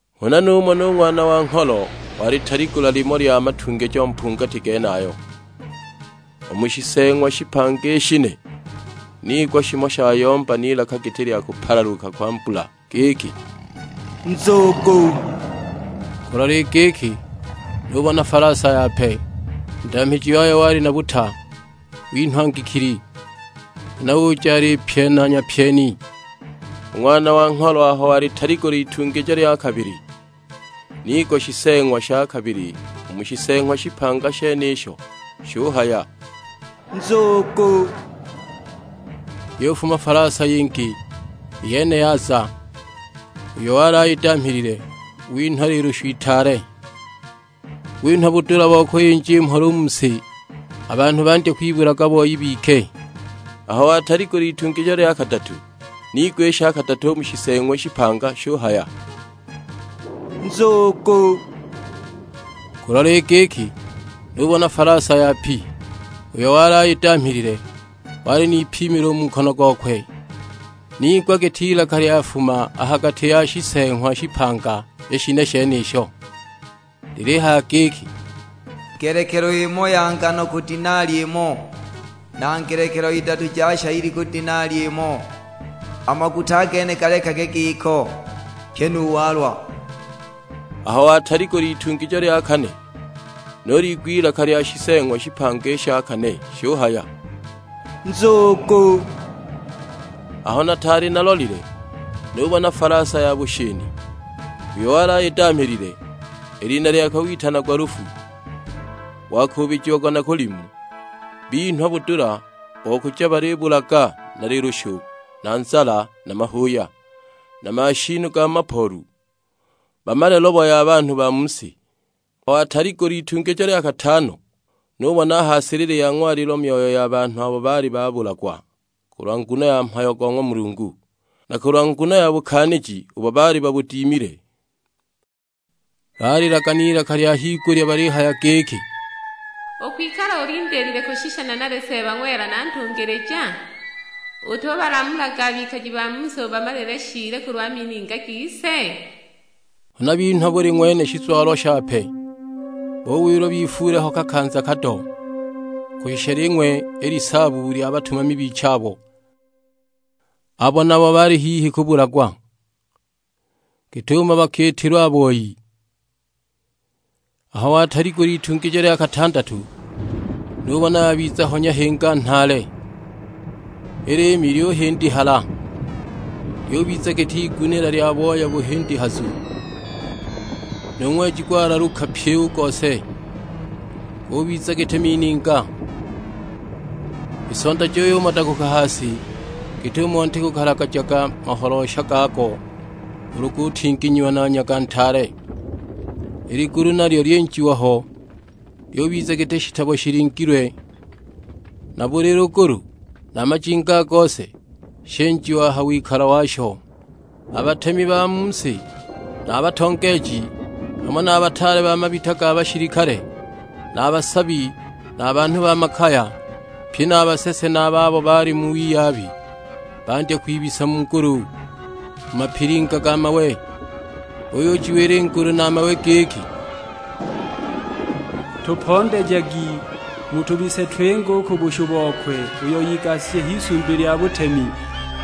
Huna numona u Ng'wana wa Ngholo walitaligula limo lya matungijo mpungati genayo. U mu shiseeng'wa shipanga i shine, niigwa shimo shayomba n'ilaka giti lya kupalaluka kwa mbula; giki, "Nzugu!" Kulola i giki, nubona falasa yape. U ndamhiji wayo wali na buta; winhwa ngikili, huna uja alipyena nyapyeni. U Ng'wana wa Ngholo aho wataligula itungijo lya kabili, niigwa Shiseeng'wa sha kabili u mu Shiseeng'wa shipanga shenisho; shuhaya, "Nzugu!" Yufuma falasa yingi, i yene yaza, uyo wali ayidamhilile winhwa lilushu itaale, winhwa budula bo kuyinja i mhola u mu si; a banhu bandye kwibulaga boi bike! Aho wataligula itungijo lya kadatu, niigwa i sha kadatu u mu Shiseeng'wa shipanga; shuhaya, "Nzugu!" Kulola i giki, nubona falasa yapi, uyo wali ayidamhilile wali n'ipimilo u mu nkono gokwe. Niigwa giti ilaka lyafuma a ha gati ya Shiseeng'wa shipanga i shine shenisho; lilihaya giki, "Ngelekelo imo ya ngano ku denali imo, na ngelekelo idatu ja shayili ku denali imo; a maguta a gene galekage giko, pyi nu walwa!" Aho wataligula itungijo lya kane, nuliigwa i lilaka lya Shiseeng'wa shipanga i sha kane; shuhaya, "Nzugu!" Aho nataali nalolile nubona falasa ya bushini; uyo wali ayidamhilile i lina lyakwe witanagwa Lufu, wakuubijiagwa na Kulimu! Binhwa budula bo kuja balibulaga na lilushu, na nzala, na mahuuya, na mashiinu ga mu mapoolu; bamale lobo ya banhu ba mu si. Aho wataligula itungijo lya katano nubona a ha silili ya ng'walilo myoyo ya banhu abo baali babulagwa kulwa nguno ya mhayo go ng'wa Mulungu, na kulwa nguno ya bukaaniji ubo baali babudimile. Baalilaga n'ilaka lya higulya balihaya giki, "Ukwikala ulindiilile kushisha nanali Seeba ng'wela na Ntungilija? Utubalamulaga a bikaji ba mu si ubamalile shiili kulwa mininga gise?" Huna binhwa buli ng'wene shizwalo shape, buwilwa bifuule ho kakanza kado, kushisha ling'we i lisaabu lya batumami bichabo, abo nabo bali hihi kubulagwa, git'umo bakiitilwa a boi! Aho wataligula itungijo lya katandatu nubona yabiza ho nyahinga nhaale; i liimi lyuhindihala, lyubiza giti igunila lya booya buhindihazu, nu ng'weji gwalaluka pyi u gose, gubiza giti mininga. I sonda juyumodaguka ha si, git'umo nti gukalagagijaga maholoosha gago ulu gutinginyiwa na nyaga ntaale. I ligulu nalyo lyinjiwa ho, lyubiza giti shitabo shilingilwe; na buli lugulu, na a majinga a gose, shinjiwa a ha wikalo washo! A batemi ba mu si na a batongeeji, hamo na a bataale ba mabita ga bashilikale, na a basabi, na a banhu ba makaya; pye na a basese na a babo bali mu wiyabi, bandya kwibisa mu ngulu, mu mapilinga ga mawe. Buyujiwila i ngulu na a mawe giki, "Tupondejagi mutubise twinge u ku bushu bokwe uyo igashije h'Isumbi lya butemi,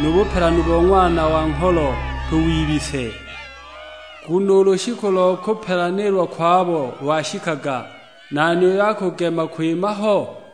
nu bupelanu bo Ng'wana wa Ngholo tuwibise! Nguno u lushiku lo kupelanilwa kwabo lwashikaga; nani uyo akugema kwima ho?"